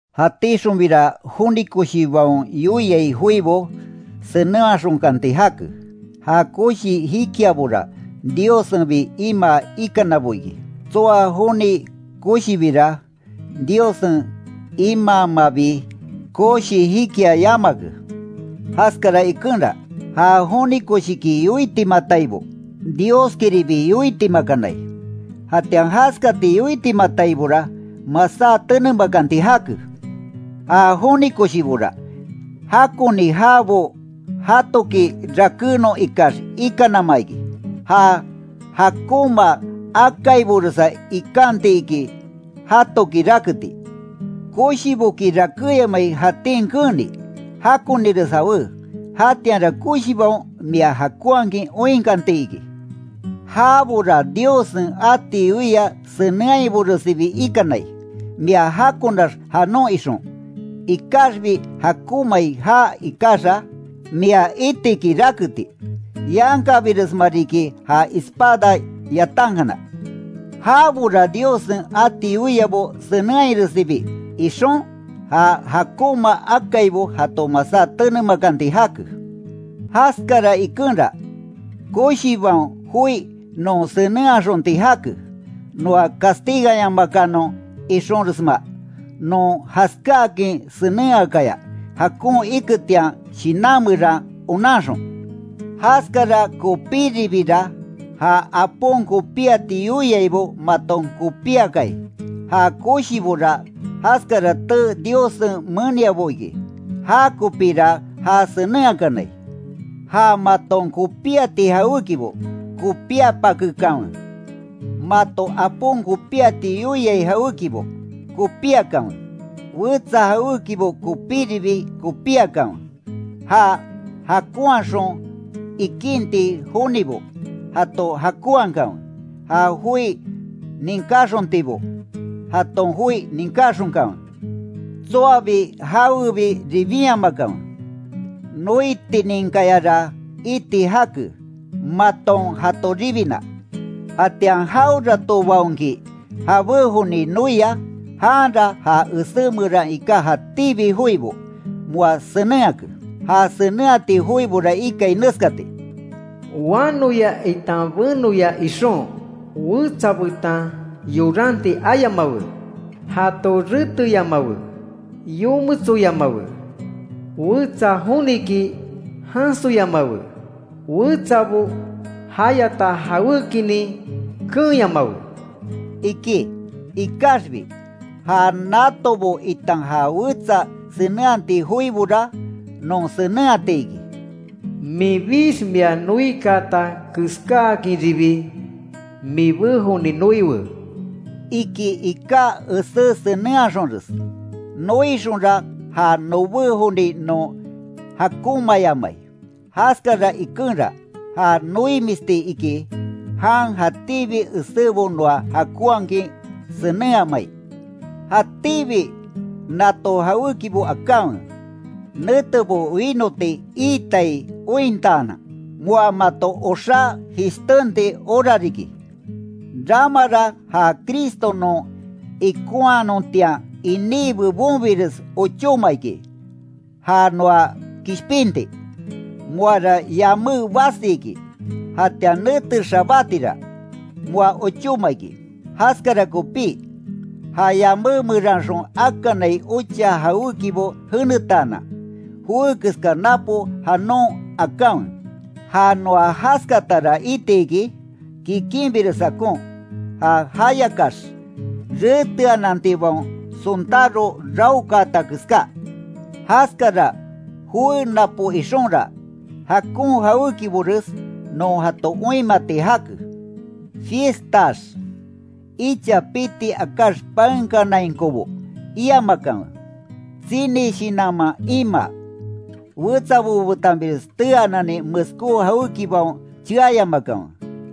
Jatíxonbira joni koshibaon yoiai joibo, senenhaxonkanti jake, ja koshi jikiabora, Diossenbi imaa ikanabo iki, tsoa joni koshibira, Diossen imaamabi koshi jikia yamake. Jaskara ikenra, ja joni koshiki yoitimataibo, Dioskiribi yoitimakanai, jatian jaskati yoitimataibora, masá tenemakanti jake. Ja joni koshibora, jakoni jaabo jatoki rakénon ikax ikanama iki. Ja jakonma akaiboresa ikanti iki, jatoki raketi. Koshiboki rakéyamai jatín keeni, jakonires jawé, jatianra koshibaon mia jakonhakin oinkanti iki. Jabora Diossen ati yoia senenhainboresibi ikanai, mia jakonax janon ixon. Ikaxbi jakonmai já ikaxa, mia itiki raketi. Yankabiresma riki ja espada yatankana. Jabora Diossen ati yoiabo senenhairesibi ixon, ja jakonma akaibo jato masá tenemakanti jake. Jaskara ikenra, koshibaon joi non senenhaxonti jake, noa castiganyamakanon ixonresma, non jaskáakin senenhakaya, jakon iketian shinan meran onanxon. Jaskara kopíribira, ja apon kopíati yoiaibo maton kopíakai. Ja koshibora jaskara tee Diossen meniabo iki, jakopíra ja senenhakanai. Ja maton kopíati jawékibo, kopíapakekanwe; mato apon kopíati yoiai jawékibo, kopíakanwe; wetsa jawékibo kopíribi kopíakanwe; ja jakonhaxon ikinti jonibo, jato jakonhakanwe; ja joi ninkáxontibo, jaton joi ninkaxonkanwe. Tsoabi jawebi ribinyamakanwe; noitininkayara iti jake, maton jato ribina. Jatian jaweratobaonki jabé joni noia, janra ja esé meran iká jatíbi joibo, moa senenhake. Ja senenhati joibora ikai neskati: “Wanoya itan benoya ixon, wetsa betan yoranti ayamawe; jato reteyamawe, yometsoyamawe, [wetsa joniki jansoyamawe], wetsabo jayata jawékinin keenyamawe”, iki. Ikaxbi, ja natobo itan ja wetsa senenhati joibora, non senenhati iki: “Minbix mia noikaata keskáakinribi mibé joni noiwe”, iki iká esé senenhaxonres. Noixonra ja nobé joni non jakonmaayamai. Jaskara ikenra, ja noimisti iki, jan jatíbi esébo noa jakonhakin senenhamai. Jatíbi nato jawékibo akanwe, netebo wínoti iitai ointaanan, moa mato oxá jishtenti hora riki. Ramara ja Cristo non ikonhanontian iní bebonbires ochóma iki, ja noa kishpinti. Moara yamé basi iki, jatian nete xabátira, moa ochóma iki. Jaskara kopí, ja yamé meranxon akanai ocha jawékibo jenetaanan, joé keska napo janon akanwe. Ja noa jaskatara iti iki, kikinbires jakon, ja jayakax reteanantibaon sontáro raokaata keská. Jaskara joé napo ixonra, jakon jawékibores non jato oinmati jake. Fiestaax, icha piti akáx paenkanainkobo iamakanwe; tsini shinanman imaa, wetsabo betanbires teaanani meskó jawékibaon cheayamakanwe;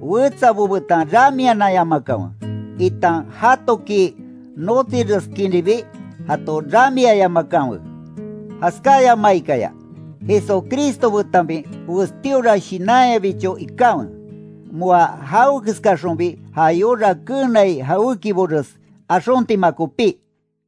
wetsabo betan ramiananyamakanwe, itan jatoki notsireskinribi jato ramiayamakanwe. Jaskáyamaikaya, Jesucristo betanbi westíora shinanyabicho ikanwe, moa jawekeskaxonbi ja yora keenai jawékibores axontima kopí.